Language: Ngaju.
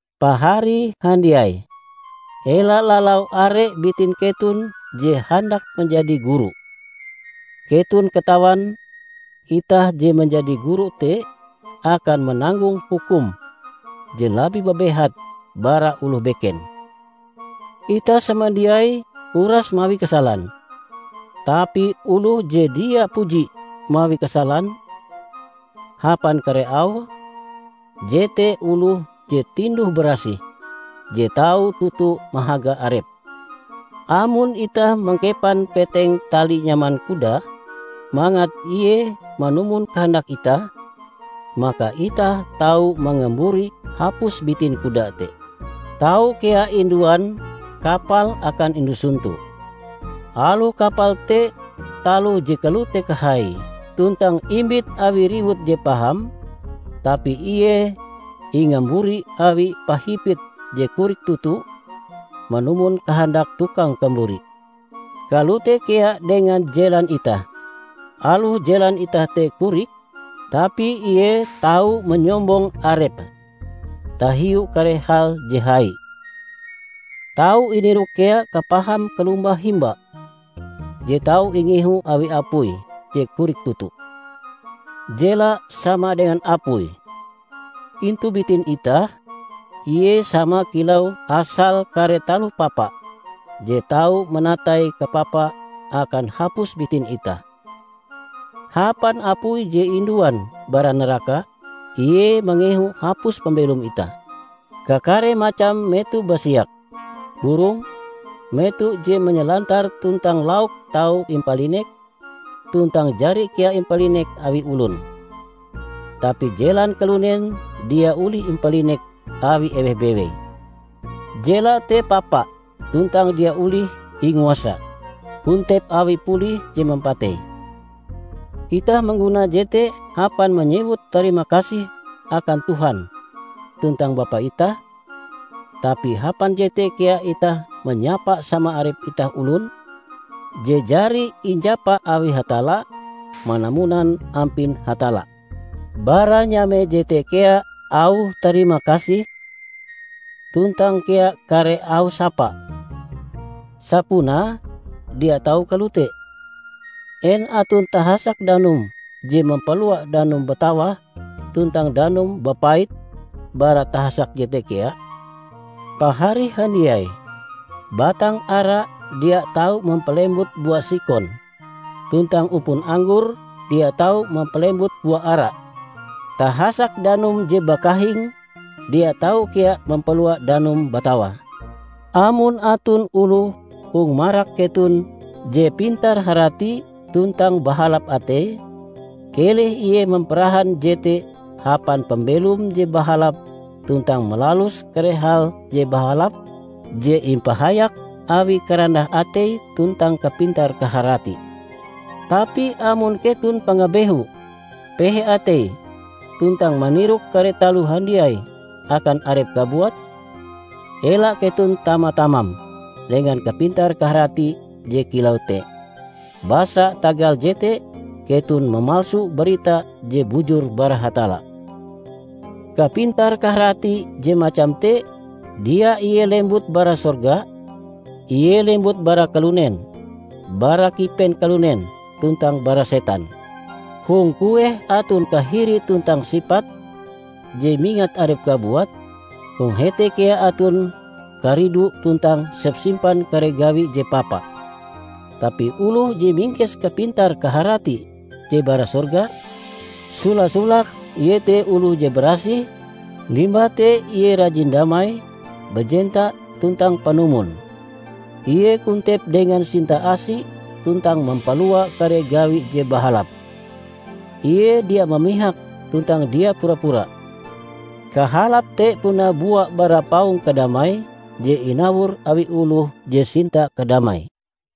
Pahari handiai! Ela lalau are bitin keton je handak manjadi guru. Keton katawan itah je manjadi guru te akan mananggong hukum je labih babehat bara oloh beken. Itah samandiai uras mawi kasalan. Tapi oloh je dia puji mawi kasalan hapan kare auhe, jete oloh je tinduh-barasih, je tau toto mahaga arepe. Amon itah mangkepan peteng tali nyaman kuda mangat ie manumon kahandak itah, maka itah tau mangamburi hapus bitin kuda te. Tau kea induan kapal akan indu sonto. Aloh kapal te taloh je kalote kahaie tuntang imbit awi riwut je paham, tapi ie ingamburi awi pahipit je korik toto, manumon kahandak tukang kamburi. Kalote kea dengan jelan itah; aloh jelan itah te korik, tapi ie tau manyombong arepe tahiu kare hal je hai. Tau inirok kea kapaham kalombah himba je tau ingehu awi apui je korik toto! Jela sama dengan apui. Intu bitin itah, ie sama kilau asal kare taloh papa je tau manatai kapapa akan hapus bitin itah. Hapan apui je induan bara naraka, ie mangehu hapus pambelom itah. Kakare macam meto basiak, burong, meto je manyalantar tuntang lauk tau impalinek, tuntang jari kea impalinek awi olon. Tapi jelan kalunen dia olih impalinek awi eweh bewei. Jela te papa tuntang dia olih inguasa; kontep awi pulih je mampatei. Itah mangguna jete hapan manyewut tarimakasih akan Tuhan tuntang Bapa itah, tapi hapan jete kea itah manyapa sama arep itah olon, je jari injapa awi Hatalla manamunan ampin Hatalla. Bara nyame jete kea auh tarimakasih tuntang kea kare auh sapa. Sapunae dia tau kalote! En aton tahasak danum je mampalua danum batawah tuntang danum bapait bara tahasak jete kea? Pahari handiai, batang ara dia tau mampalembut bua sikon, tuntang upon anggor dia tau mampalembut bua ara. Tahasak danum je bakahing dia tau kea mampalua danum batawah. Amon aton oloh hong marak keton je pintar-harati tuntang bahalap ateie, keleh ie mamparahan jete hapan pambelom je bahalap tuntang malalus kare hal je bahalap je impahayak awi karandah atei tuntang kapintar kaharati. Tapi amon keton pangabehu, pehe atei, tuntang manirok kare taloh handiai akan arep kabuat, ela keton tama-tamam dengan kapintar-kaharati je kilau te, basa tagal jete keton mamalsu barita je bujur bara Hatalla. Kapintar kaharati je macam te dia ie lembut bara sorga. Ie lembut bara kalunen, bara kipen kalunen, tuntang bara setan! Hong kueh aton kahiri tuntang sipat je mingat arep kabuat, hong hete kea aton karidu tuntang sepsimpan kare gawi je papa. Tapi oloh je mingkes kapintar kaharati je bara sorga, sola-solake iete oloh je barasih, limbah te ie rajin damai, bajenta, tuntang panumon. Ie kontep dengan sinta-asi tuntang mampalua kare gawi je bahalap. Ie dia mamihak tuntang dia pura-pura. Kahalap te puna bua bara paung kadamai je inawor awi oloh je sinta kadamai!